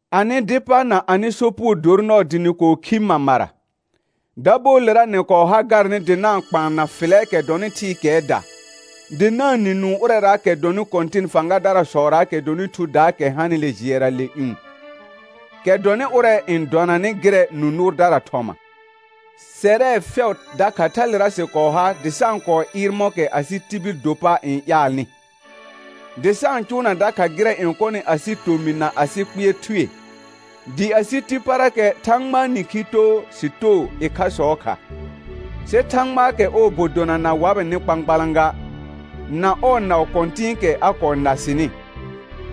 Anɩ dɩ pa na anɩ sopugo dor nɔɔ dɩ nɩ kɔɔ khi mamara; dabɔɔlera nɩ kɔɔ ha garnɩ dɩ na-n kpaan na fɩlɛɛkɛ dɔnɩ thɩɩkɛɛda, dɩ na-n nɩ nũu ʋrɛraakɛ dɔnɩ kɔ̃tɩn fãgadarasɔraakɛ dɔnɩ thudaakɛ hanɩ jɩɛra le ƴũ, kɛ dɔnɩ ʋrɛ n dɔnanɩ gɩrɛ nũ nʋʋrdara thɔma. Sɛrɛ fɛʋ dakha thalera sɩ kɔɔ ha dɩ sa-n kɔɔ ɩɩr mɔ̃kɛ asɩ tibil do pa n ƴaalnɩ, dɩ sa-n cʋʋna dakha gɩrɛ n kɔnɩ asɩ tomɩ na asɩ kpɩɛr thue, dɩ asɩ ti parakɛ Thãgbaa nĩkhi too sɩ too ɩkhasɔɔ kha. Sɩ Thãgbaakɛ ɔɔ bɔ dona na wabɩnɩ kpãkpalã ga, na ɔɔ naʋ kɔ̃tɩ̃ɩkɛ a kɔɔ na sɩnɩ,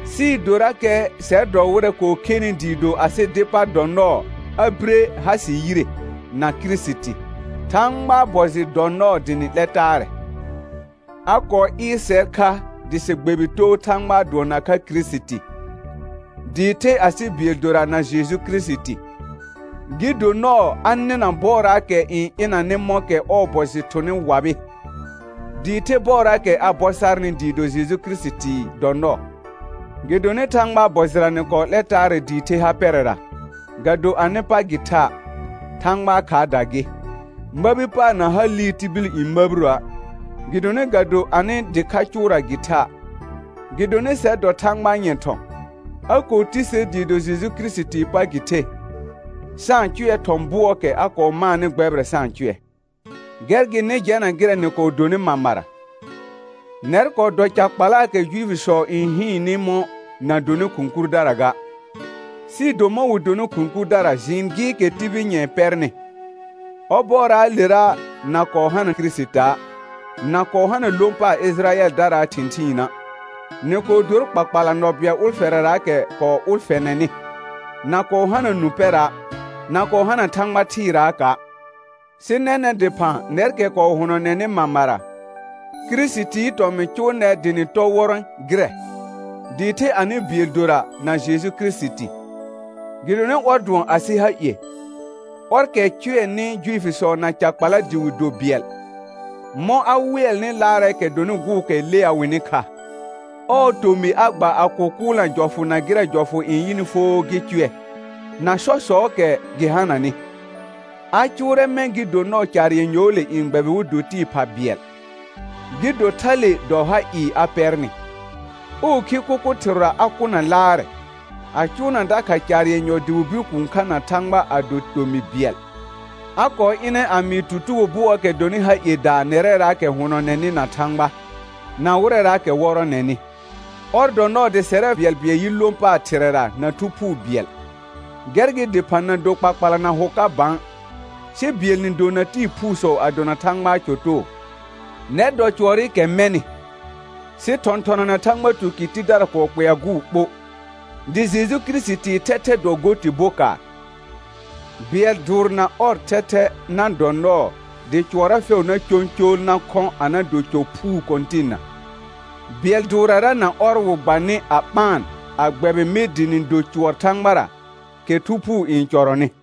sɩɩ dorakɛ sɛr dɔ wɩrɛ kɔɔ khenɩ dɩɩ do asɩ dɩ pa dɔ nɔɔ a bire ha sɩ yire na Kirisiti. Thãgbaa bɔ jɩ dɔ nɔɔ dɩ nɩ 'lɛ taarɛ. A kɔɔ ɩɩr sɛr kha dɩ sɩ gbɛbɩ too Thãgbaa dʋɔ nakha Kirisiti, dɩɩ the asɩ bɩɛl dora na Jeju Kirisiti. Gɩ do nɔɔ a nɩna bɔɔraakɛ n ɩnanɩ mɔ̃kɛ ɔɔ bɔ jɩ thʋnɩ wabɩ, dɩɩ the bɔɔraakɛ a bɔ sarnɩ dɩɩ do Jeju Kirisiti dɔ nɔɔ. Gɩdonɩ Thãgbaa bɔ jɩra nɩ kɔɔ 'lɛ taarɛ dɩɩ the ha pɛrɛra, ga do anɩ pa gɩ tha', Thãgbaa khaarda gɩ. Məbi paar na ha liir tibil n məbiroə', gɩdonɩ ga do anɩ dɩkha cʋʋra gɩ tha'. Gɩdonɩ sɛr dɔ Thãgbaa nyɛ̃ thɔ̃; a kɔɔ ti ser dɩɩ do Jeju Kirisitii pa gɩ the, sa-n cʋɛ thɔ̃ bʋɔɔkɛ a kɔɔ maanɩ gbɛbɩrɛ sa-n cʋɛ. Gɛr gɩ nɩ jɛna gɩrɛ nɩ kɔɔ donɩ mamara, nɛr kɔɔ dɔ ca kpalaakɛ Juifisɔ n hɩɩnnɩ mɔ̃ na donɩ khʋ̃ kurdara ga, sɩɩ do mɔ̃ wɩ donɩ khʋ̃ kurdara jɩɩn gɩɩkɛ tibil nyɛ̃ɛ pɛrnɩ. Ɔbɔɔraalera na kɔɔ hana Kirisita', na kɔɔ hana lõ paar Ɩjɩrayɛldaraa thɩ̃thɩɩna', nɩ kɔɔ dor kpakpala nɔ bɩɛl ʋlfɛrɛraakɛ kɔɔ ʋlfɛnɛnɩ, na kɔɔ hana nũ pɛra', na kɔɔ hana Thãgba thɩɩraaka'. Sɩ nɛnɛ̃ dɩphã nɛrkɛ kɔɔ hʋnɔnɛnɩ mamara, Kirisitii tɔmɩ̃ cʋʋ nɛr dɩ nɩ tɔ wɔrɔ̃ gɩrɛ, dɩɩ the anɩ bɩɛl dora na Jeju Kirisiti. Gɩdonɩ ɔr dʋɔn asɩ ha ie, ɔrkɛ cʋɛnɩ Juifisɔ na ca kpala dɩ wɩ do bɩɛl, mɔ̃ a wɩɛlnɩ laarɛɛkɛ dɔnɩ gʋʋkɛ lea wɩnɩ kha. Ɔɔ tomɩ a gba a kʋkʋʋlna jɔfʋ na gɩrɛ jɔfʋ n yɩnɩ foo gɩ cʋɛ, na sɔsɔɔkɛ gɩ hananɩ, a cʋʋrɛ mɛ̃ gɩ do nɔɔ caar yenyɔɔle n gbɛbɩ wɩ do tɩɩ pha bɩɛl, gɩ do thale dɔ ha ɩɩ a pɛrnɩ. Ɔɔ khi kʋkʋ thɩrʋra a kʋna laarɛ, a cʋʋna dakha caar yenyɔ dɩ wɩ bir kũu kha na Thãgba a do tomɩ bɩɛl. A kɔɔ ɩnɛ a mɩɩ tutugo bʋɔɔkɛ dɔnɩ ha iedaa nɛrɛraakɛ hʋnɔnɛnɩ na Thãgba, na wɩrɛraakɛ wɔrɔnɛnɩ. Ɔr dɔ nɔɔ dɩ sɛrɛ bɩɛlbɩɛl yɩ lõ paar Thɩrɛra na Thu Phuu bɩɛl. Gɛr gɩ dɩphã na do kpakpala na hʋ ka bã, sɩ bɩɛl nɩ do na tɩɩ phuusɔ a dona Thãgbaa cɔ too. Nɛr dɔ cʋɔrɩkɛ mɛnɩ, sɩ thɔ̃thɔna na Thãgba tukɩr tidara kɔɔ kpɛa gʋʋ ɓo, dɩ Jeju Kirisitii thɛthɛ dɔ go tɩ bokaar. Bɩɛl dʋʋr na ɔr thɛthɛ na dɔ nɔɔ dɩ cʋɔrra fɛʋ na cõcool na khɔ̃ a na do cɔ phuu Kɔ̃tɩnna. Bɩɛl dʋʋrrara na ɔr wɩ gba nɩ a ɓaan a gbɛbɩ mɩ dɩ nɩ do cʋɔr Thãgbara, kɛ Thu Phuu n cɔrɔnɩ.